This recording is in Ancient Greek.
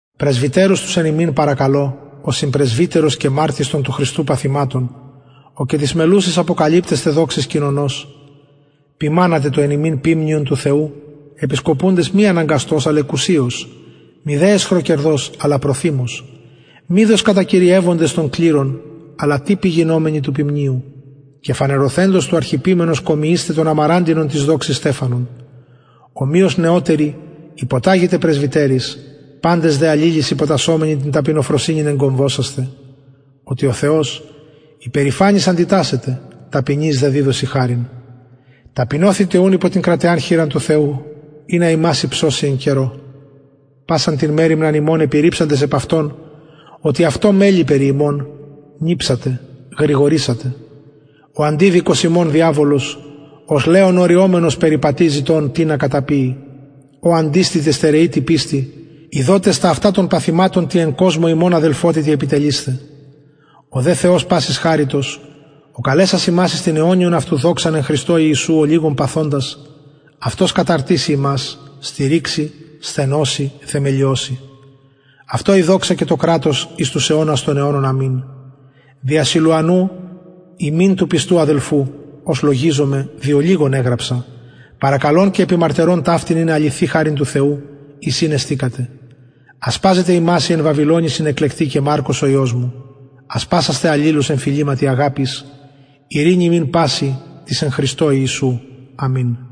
πρεσβυτερους τους εν υμιν παρακαλω ο συμπρεσβυτερος και μαρτυς των του χριστου παθηματων ο και της μελλουσης αποκαλυπτεσθαι δοξης κοινωνος ποιμανατε το εν υμιν ποιμνιον του θεου επισκοπουντες μη αναγκαστως αλλ εκουσιως μηδε αισχροκερδως αλλα προθυμως μηδε ως κατακυριευοντες των κληρων αλλα τυποι γινομενοι του ποιμνιου και φανερωθεντος του αρχιποιμενος κομιεισθε τον αμαραντινον της δοξης στεφανον ομοιως νεωτεροι υποταγητε πρεσβυτεροις παντες δε αλληλοις υποτασσομενοι την ταπεινοφροσυνην εγκομβωσασθε οτι ο θεος υπερηφανοις αντιτασσεται ταπεινοις δε διδωσιν χαριν ταπεινωθητε ουν υπο την κραταιαν χειρα του θεου ινα υμας υψωση εν καιρω πασαν την μεριμναν υμων επιρριψαντες επ αυτον οτι αυτω μελει περι υμων νηψατε γρηγορησατε ο αντιδικος υμων διαβολος ως λεων ωρυομενος περιπατει ζητων τινα καταπιη ω αντιστητε στερεοι τη πιστει ειδοτες τα αυτα των παθηματων τη εν κοσμω υμων αδελφοτητι επιτελεισθαι ο δε θεος πασης χαριτος ο καλεσας υμας εις την αιωνιον αυτου δοξαν εν χριστω ιησου ολιγον παθοντας αυτος καταρτισαι υμας στηριξει σθενωσει θεμελιωσει αυτω η δοξα και το κρατος εις τους αιωνας των αιωνων αμην δια σιλουανου υμιν του πιστου αδελφου ως λογιζομαι δι ολιγων εγραψα παρακαλων και επιμαρτυρων ταυτην ειναι αληθη χαριν του θεου εις ην εστηκατε ασπαζεται υμας η εν βαβυλωνι συνεκλεκτη και μαρκος ο υιος μου ασπασασθε αλληλους εν φιληματι αγαπης ειρηνη υμιν πασιν τοις εν χριστω ιησου αμην